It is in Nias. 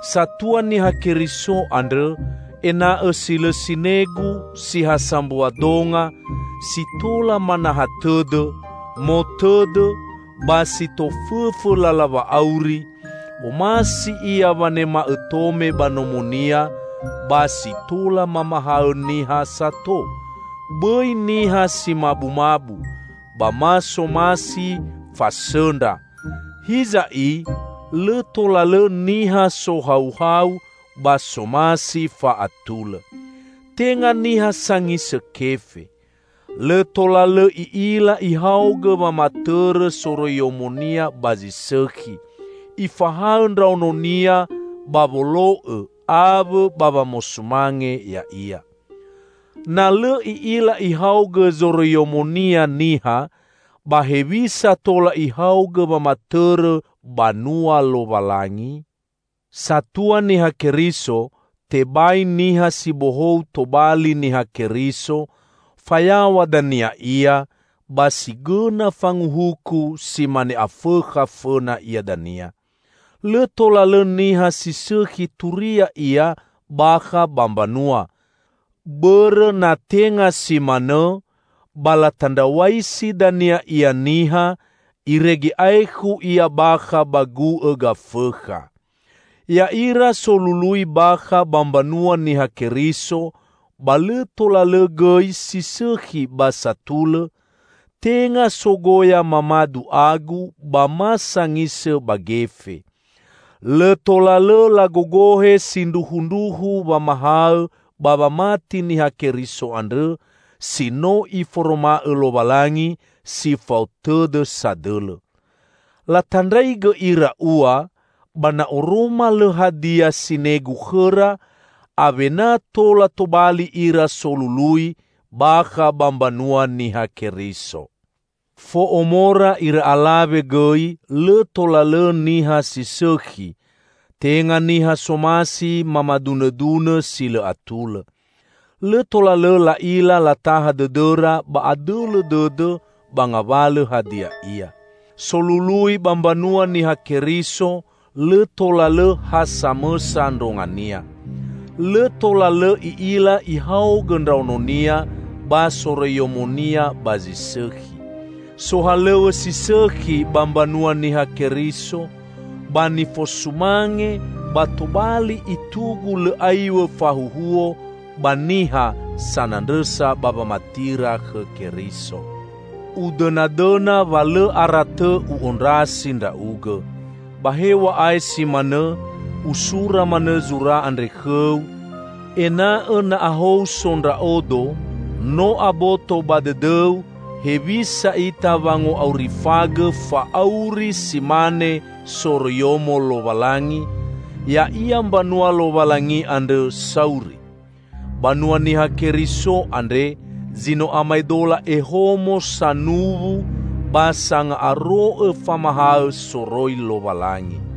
Satua Niha Keriso andrõ, ena'õ si lõ sinegu, si ha sambua donga, si tola manaha tõdõ, otõdõ, ba si tofõfõ lala wa'auri; omasi ia wanema'õ tome ba nomonia, ba si tola mamahaõ niha sato, bõi niha si mabumabu, ba ma somasi fasõndra. Hiza i, lõ tola lõ niha sohauhau ba somasi fa'atulõ. Tenga niha sangisõ kefe. Lõ tola lõ i'ila ihaogõ wamatõrõ soroiyomonia ba zi sõkhi, ifahaõ ndraononia ba wolo'õ awõ ba wamosumange ya'ia. Na lõ i'ila ihaogõ zoroiyomonia niha, ba hewisa tola ihaogõ wamatõrõ banua Lowalangi? Satua Niha Keriso, tebai niha si bohou tobali Niha Keriso, fayaw̃a dania ia, ba si gõna fanguhuku si mane Afõkha fõna ia dania. Lõ tola lõ niha si sõkhi turia ia bakha ba mbanua; bõrõ na tenga si manõ, ba latandraw̃aisi dania ia niha, irege aekhu ia bakha ba gu'õ Gafõkha. Ya'ira solului bakha ba mbanua Niha Keriso ba lõ tola lõ gõi si sõkhi ba satulõ; tenga sogoya mamadu agu ba ma sangisõ ba gefe. Lõ tola lõ lagogohe sindruhundruhu wamahaõ ba wamati Niha Keriso andrõ si no Iforoma'õ Lowalangi si fao tõdõ sadõlõ. Latandraigõ ira ua, ba na oroma lõ hadia sinegu khõra, awena tola tobali ira solului bakha ba mbanua Niha Keriso. Fo'omora ira alawe gõi lõ tola lõ niha si sõkhi, tenga niha somasi mamadunõdunõ si lõ atulõ. Lõ tola lõ la'ila lataha dõdõra ba adõlõ dõdõ ba ngawalõ hadia ia. Solului ba mbanua Niha Keriso lõ tola lõ ha samõsa ndrongania. Lõ tola lõ i'ila ihaogõ ndraononia ba soroiyomonia ba zi sõkhi. Sohalõw̃õ si sõkhi ba mbanua Niha Keriso, ba nifosumange ba tobali itugu lõ aiw̃õ fahuhuo ba niha, sanandrõsa ba wamatira khõ Keriso. Udõnadõna wa lõ aratõ u'ondrasi ndra'ugõ. Ba hew̃a'ae si manõ, usura manõ zura andre khõu, ena'õ na ahou so ndra'odo, no aboto ba dõdõu hewisa ita wango'aurifagõ fa'auri si mane soroiyomo Lowalangi, ya'ia mbanua Lowalangi andrõ sauri. Banua Niha Keriso andre zi no amaedola ehomo sanuwu ba sanga'aro'õ famahaõ soroi Lowalangi.